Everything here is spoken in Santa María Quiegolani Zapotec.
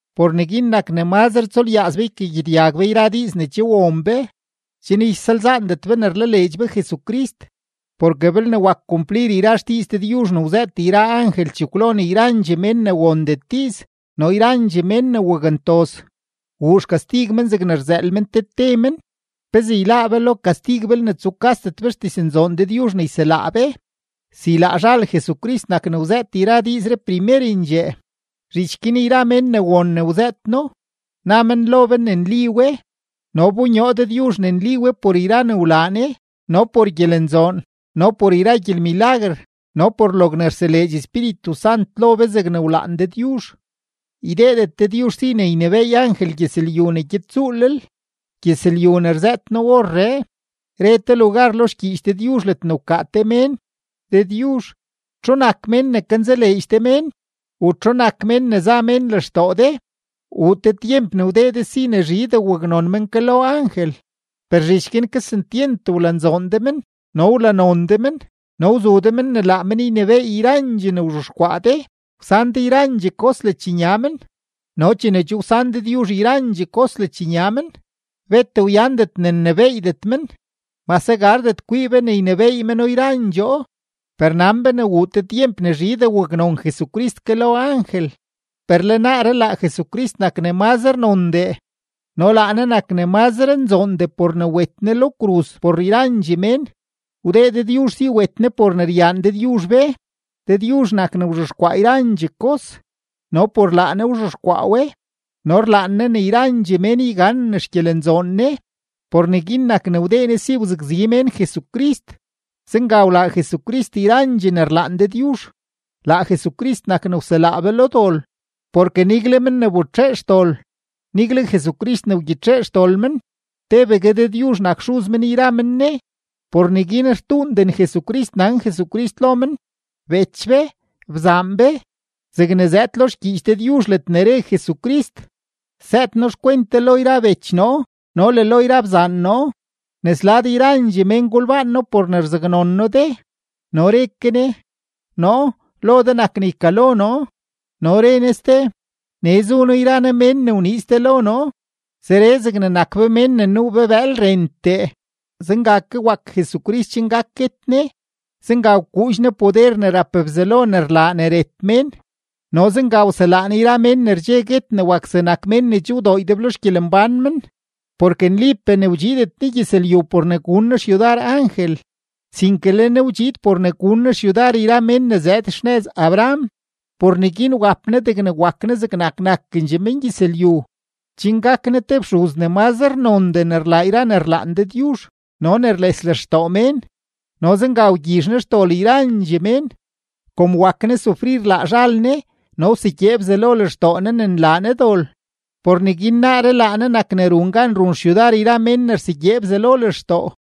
Por neguin nak ne mazre tsulyaaz be ykagyedyag be yra diiz ne che won be, chen ysalzaandet be ne rlaleedx be Jesucrist. Porke belne wak kumplir yra xdiiz Dëdyuzh ne wzëët yra angel chekwlo ne yrandxee mén ne wondet diiz no yrandxee mén ne wakntoz, wuu xkastig men zegne rzëël men te te men, ¿pezee yláá be lo kastig belne rukasdet be xdiznzoon Dëdyuzh ne yselaa be? Si laa zhal Jesucrist nak ne wzëët yra diizree primerendxee, zhich guin yra men ne won ne wzëët No, na men lo be ne nli we. No wbonyoo Dëdyuzh ne nli we por yra ne wlaa Ne no por gyelenzoon no por yra gyelmilaguer no por logne rseleedx Espíritu Sant lo be zegne wlaan Dëdyuzh. Ydeedet Dëdyuzh si ne ynebééy angel gyëzlyu ne gyed tsuulel, gyëzlyu ne rzëët noo orree. Re te lugar lo xgyiich Dëdyuzh ledne wkaa te mén: Dëdyuzh, ¿txu nak mén ne kanzaleedx de mén u txu nak mén ne za mén lextoo de? Wuu te tyemp ne wdee de si ne zhidee waknon men ke lo angel, per zhich guin kesentyent wlanzoon de men no wlanon de men no wzu de men ne laa men ynebééy yrandxee ne wzhexkwaa de; wsan de yrandxee kos ledxnya men. No chene che wsan Dëdyuzh yrandxee kos ledxnya men, bet wyandet ne nnebééydet men, mase gardet kwii be ne ynebééy meno yrandxoo. Per nan be ne wuu te tyemp ne zhidee waknon Jesucrist ke lo angel, per le naaree laa Jesucrist nak ne mazre nondee no laa Ne nak ne mazre nzoondee por ne wet Ne lo kruz por yrandxee mén; wdee Dëdyuzh si wet Ne por ne ryaan Dëdyuzh be. Dëdyuzh nak ne wzhexkwaa yrandxee kos no por laa Ne wzhexkwaa we, no rlaan Ne ne yrandxee mén yganen xgyelenzoon Ne. Por neguin nak ne wdee Ne si wzakzi mén Jesucrist, zenga wlaa Jesucrist yrandxee ne rlaan Dëdyuzh, laa Jesucrist nak ne wselaa be lo dol. Porke nigle men ne wbetxee xdol, nigle Jesucrist ne wgyitxee xdol men, tebegue Dëdyuzh nak Xuz men yra men Ne. Por neguin rtuunden Jesucrist nan Jesucrist lo men: “Bech be, bzaan be”, zegne zëëd lo xgyiich Dëdyuzh ledne re Jesucrist: Sëët noo xkwent de lo yra bech noo no le lo yra bzaan noo, nes lad yrandxee mén golbaan noo por ne rzaknon noo de. No re ke Ne: Noo, lo de nak ne ykalo noo. No re Ne ste: Nee zu noo yra noo mén ne wniiz de lo noo. Zeree zegne nak be mén ne nuu be bëël rentee, zenga ke wak Jesucrist chen gak guet Ne, zenga wkuudx Ne poder ne rap Bzelo ne rlaa ne ret mén no zenga wselaa Ne yra mén ne rdxe guet ne wak zegnak mén ne che wdoo ydeblo xgyelembán men. Porke nlipee ne wdxiidet Ne gyëzlyu por ne gun Ne xyudar angel, sinke le Ne wdxiid por ne gun Ne xyudar mén ne zëëd xnëz Abraham. Por neguin wap Ne degne wak Ne zegnak nakendxee mengyëzlyu, chen gak Ne te fxuz ne mazre nondee ne rlaa yra ne rlaan Dëdyuzh no ne rles lextoo mén no zenga wgyizh Ne xdol yrandxee mén. Kom wak Ne sufrir laa zhal Ne no wsegyee Bzelo lextoo Ne ne nlaa Ne dol, por neguin naaree laa Ne nak ne run gan run xyudar yra men ne rsegyee Bzelo lextoo.